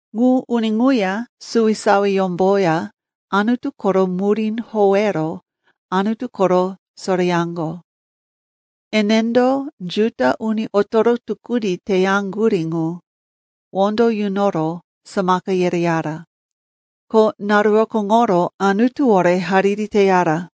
Ŋu uni ŋuya suwisawiyómboya Anutu koro murí howero Anutu koro soreyaŋgo. Enendo Juda uni otoro tukuni teyaŋgurí ŋu wondo yunoro samaka yereyara. Ko naru rokóŋoro Anutuwore hariri teyara.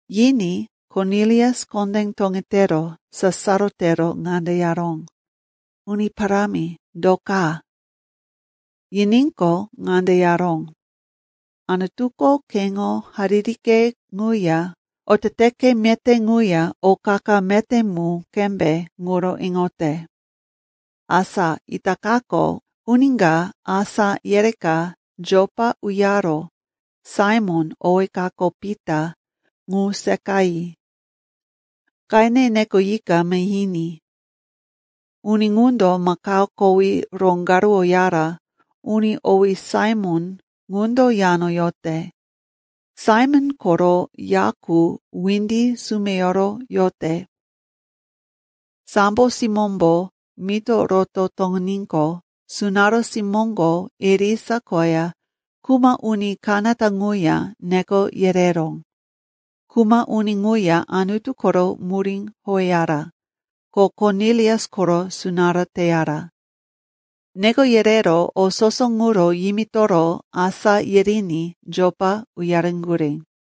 Yiní Kornilius kondé toŋetero sasaro tero ŋande yaró, “Uni parámi, do ka?” Yiníqo, ŋande yaró, “Anutuko keŋo haririke ŋuya oteteke meté ŋuya o qa-qa meté mu qembe ŋuro iŋote. Asa itakako uni ka asá yereka Jopa uyaro Saimon, owí kako Pita, ŋu seqayi. Qene nekoyika mahiní. Uni ŋundo makao kowí roŋgaruwoyara uni owí Saimon ŋundo yano yote. Saimon koro ya qu windi sumeyoro yote.” Sambo simómbo mito roto toŋiníqo, sunará simóŋo irisa koya kuma uni kanata ŋuya neko yereró. Kuma uni ŋuya Anutu koro murí howeyara, ko Kornilius koro sunará teyara. Neko yerero o soso ŋuro yimitoro asá yiriní Jopa uyareŋgurí.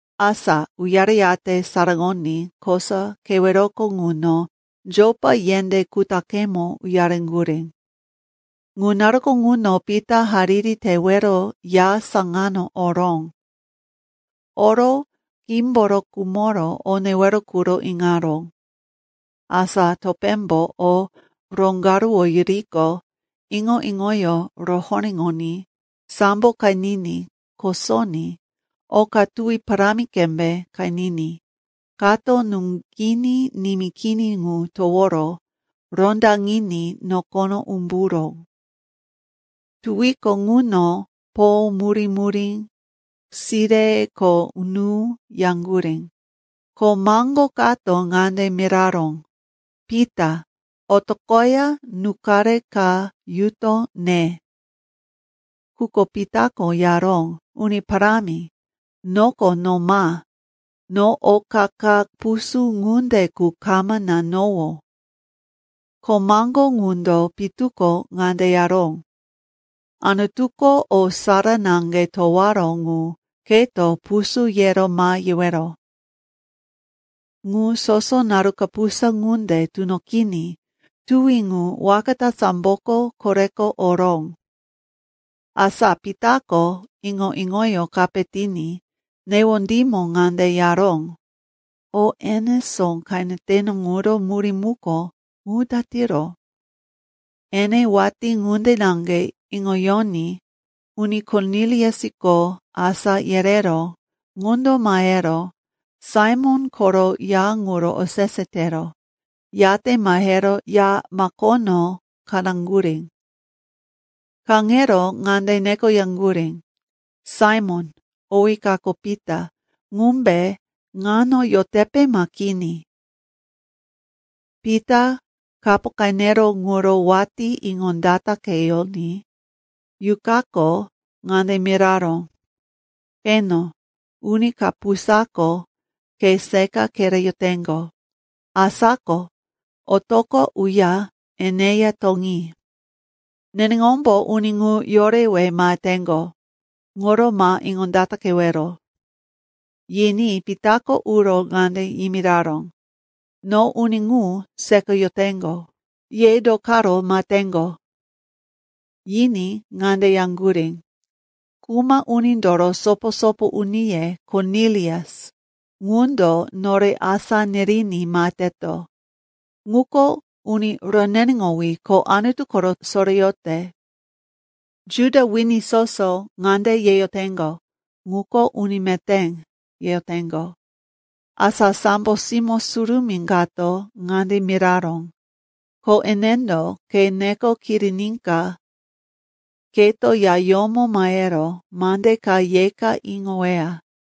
Asa uyareyate saraŋoní kosa keweroko ŋuno Jopa yendé kutaqemo uyareŋgurí. Ŋu naruko ŋuno Pita hariri tewero ya saŋano oró. Oro qímboro khumoro o newero quro iŋaró. Asa topémbo o roŋgaruwoyuriqo, iŋo-iŋoyó rohoréŋoní sambo qeniní kosoní oka tuwi parámi qembe qeniní kato nuŋginí nimí kini ŋu toworo rondaŋiní nokono umburó. Tuwiko ŋuno po murí-murí, sire ko nú yaŋgurí. Ko maŋgo kato ŋande miraró, “Pita, otoqoya nú-qare ka yuto ne.” Quko Pitako yaró, “Uni Parámi, noko no ma! No oka ka pusú ŋunde qu kama nanowó.” Ko maŋgo ŋundo pitu ko ŋande yaró, “Anutuko o sara naŋge towaró ŋu keto pusú yero ma yewero.” Ŋu soso naru kapusa ŋunde tunoqiní tuwi ŋu waka ta samboko koreko oró. Asa Pitako iŋo-iŋoyó kape tiní newondímo ŋande yaró, “O enesó qeneteno ŋuro murí muko, ŋu datiro?” Ene watí ŋunde naŋge iŋoyoní uni Korniliusko asa yereró ŋundo mahero Saimon koro ya ŋuro osese tero, yate mahero ya makono kaŋaŋgurí. Kaŋero ŋande nekoyaŋgurí, “Saimon, owí kako Pita, ŋumbe ŋano yotepe ma kini?” Pita kapo qeneró ŋuro watí iŋondataqeyoní Yuqako ŋande miraró, “Qeno, uni kapusako ke seqa kereyoteŋgo. Asa ko otoqo uya eneya toŋi. Neneŋombo uni ŋu yorewe maheteŋgo. Ŋuro ma iŋondataqewero.” Yiní Pitako uro ŋande yimiraró, “No uni ŋu seqayoteŋgo. Ye do karo maheteŋgo?” Yiní ŋande yaŋgurí, “Kuma unindoro sopo-sopo uniye Kornilius, ŋundo nore asá niriní maheteto. Ŋuko uni roneneŋowí ko Anutu koro soreyote. Juda wini soso ŋande yeyoteŋgo, ‘Ŋuko uni meté,’ yeyoteŋgo. Asa sambo simó surumí kato ŋande miraró, ko enendo ke neko kiriníka keto yayómo mahero mande ka yeka iŋoweya.”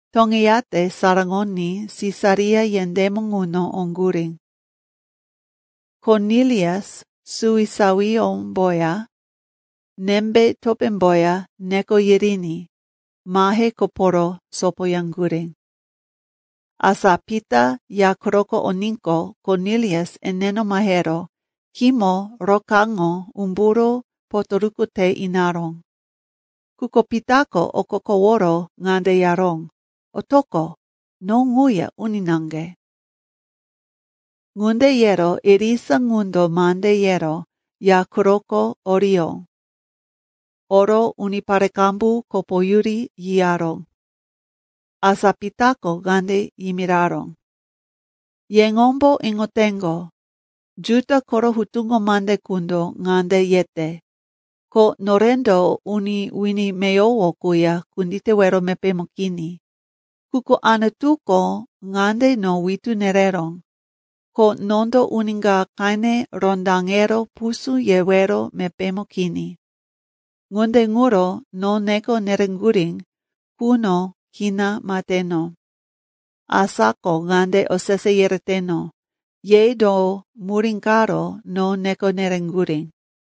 Toŋeyate saraŋoní Sisaria yendémo ŋuno oŋgurí. Kornilius suwisawiyómboya nembe topémboya neko yiriní mahe koporo sopoyaŋgurí. Asa Pita ya quroko oníqo, Kornilius eneno mahero khímo rokaráŋo umburo potoruku te inaró. Quko Pitako okokoworo ŋande yaró, “Otoqo. No ŋuya uni naŋge.” Ŋunde yero irisa ŋundo mande yero ya quroko oriyó. Oro unipare qambu kopoyuri yiyaró. Asa Pitako ŋande yimiraró, “Yeŋombo iŋoteŋgo, Juda koro hutuŋo mande qundo ŋande yete, ko norendo uni wini meyowo quya kunditewero mepémo kini. Quko Anutuko ŋande no witú nereró, ko nondo uni ka qene rondaŋero pusú yewero mepémo kini. Ŋunde ŋuro no neko nereŋgurí quno kina maheteno. Asa ko ŋande osese yereteno, ye do murí karo no neko nereŋgurí?”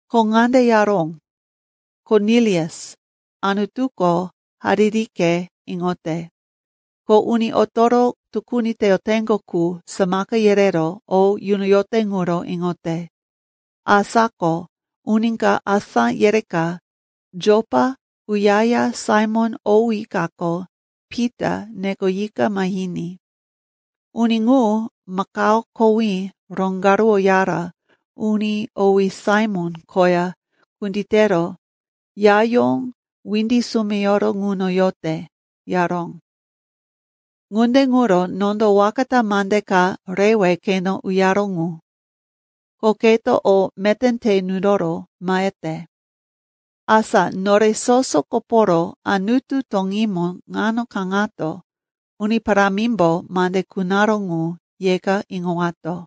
Ko ŋande yaró, ‘Kornilius, Anutuko haririke iŋote, ko uni otoro tukuni teyoteŋgo qu samaka yerero o yunoyote ŋuro iŋote. Asa ko uni ka asá yereka Jopa uyaya Saimon owí kako Pita nekoyika mahiní. Uni ŋu makao kowí roŋgaruwoyara uni owí Saimon koya kunditero yayó windi sumeyoro ŋuno yote,’ yaró. Ŋunde ŋuro nondo waka ta mande ka rewe keno uyaró ŋu. Ko keto o meté te nunoro mahete. Asa nore soso koporo Anutu toŋímo ŋano kaŋato Uni Parámimbo mande kunaró ŋu yeka iŋowato.”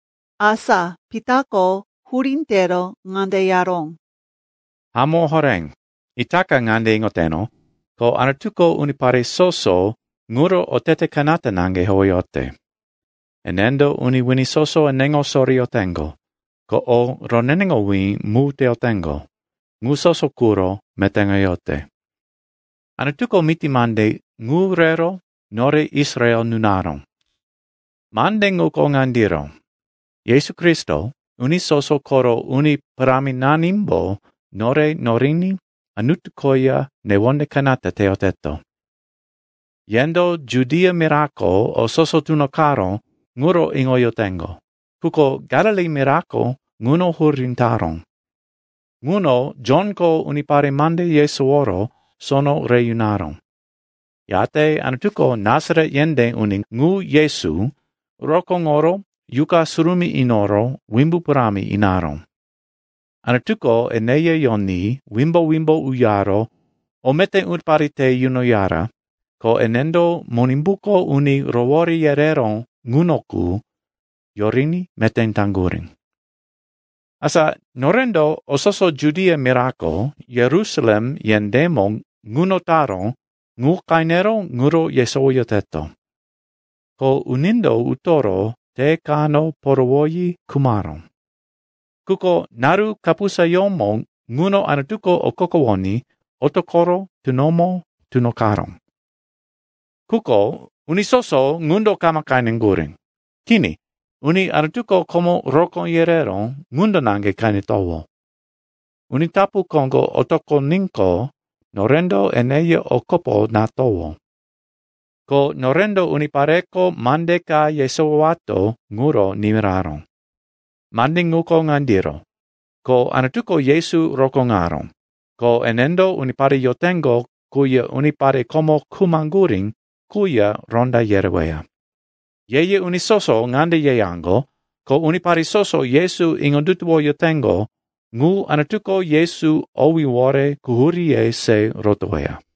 Asa Pitako hurí tero ŋande yaró, “Hamó horé, itaka ŋande iŋoteno, ko Anutuko unipare soso ŋuro otete kanata naŋge howeyote. Enendo uni wini soso eneŋo soreyoteŋgo, ko o roneneŋowí mu teyoteŋgo, ŋu soso quro metéŋoyote. Anutuko miti mande ŋu rero nore Israel nunaró. Mande ŋuko ŋandiro: Yesu Kristo, uni soso koro Uni Paráminanimbo nore noriní Anutu koya newonde kanata teyoteto. Yendo Judia mirako o soso tunoqaró ŋuro iŋoyoteŋgo, quko Galili mirako ŋuno hurí taró. Ŋuno Jonko unipare mande yesoworo sono re yunaró. Yate Anutuko Nasaret yendé uni ŋu, Yesu, rokóŋoro Yuqa Surumí inoro wimbu parámi inaró. Anutuko eneya yoní wimbo-wimbo uyaro o meté unipare te yunoyara, ko enendo Monimbuko uni rowore yereró ŋuno qu yoriní meté taŋgurí. “Asa norendo o soso Judia mirako, Yerusalem yendémo ŋuno taró ŋu qenero ŋuro yesowoyoteto. Ko unindo utoro te kano porowoyi khumaró. Quko naru kapusayómo ŋuno Anutuko okokowoní otoqoro tunomo tunoqaró. Quko uni soso ŋundo kama qeneŋgurí. Kini, uni Anutuko komo rokó yereró ŋundo naŋge qenetowó. Uni tapu koŋgo otoqoníqo, norendo eneya o kopo natowó. Ko norendo unipareko mande ka yesowowato ŋuro nimiraró. Mande ŋuko ŋandiro, ko Anutuko Yesu rokóŋaró, ko enendo unipare yoteŋgo quya unipare komo khumaŋgurí quya ronda yereweya. Ye-ye uni soso ŋande yeyaŋgo, ko unipare soso Yesu iŋondutuwoyoteŋgo ŋu, Anutuko Yesu owíwore quhuríye se rotoweya.”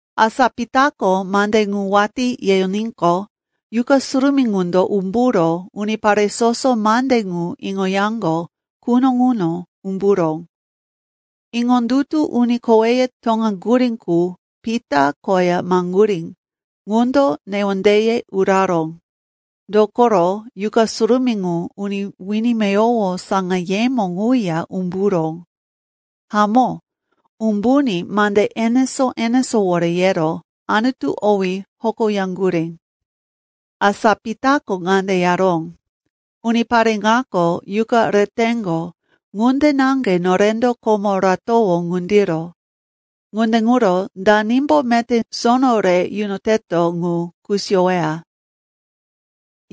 Asa Pitako mande ŋu watí yeyoníqo, Yuqa Surumí ŋundo umburo unipare soso mande ŋu iŋoyaŋgo quno ŋuno umburó. Iŋondutu uni koweye toŋaŋgurí qu Pita koya maheŋgurí ŋundo newondeye uraró, dokoro Yuqa Surumí ŋu uni wini meyowo saŋayemo ŋuya umburó. Hamó, umbuní mande enesó-enesówore yero Anutu owí hokoyaŋgurí. Asa Pitako ŋande yaró, “Unipare ŋako Yuqa reteŋgo ŋunde naŋge norendo komo ratowó ŋundiro. Ŋunde ŋuro danimbo meté sono re yunoteto ŋu kusiyoweya?”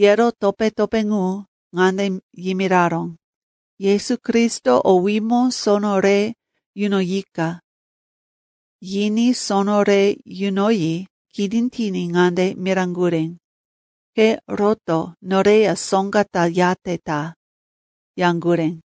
Yero topé-topé ŋu ŋande yimiraró, “Yesu Kristo owímo sono re yunoyika.” Yiní sono re yunoyi kini tiní ŋande miraŋgurí, “Ke roto noreya soŋga ta yate ta,” yaŋgurí.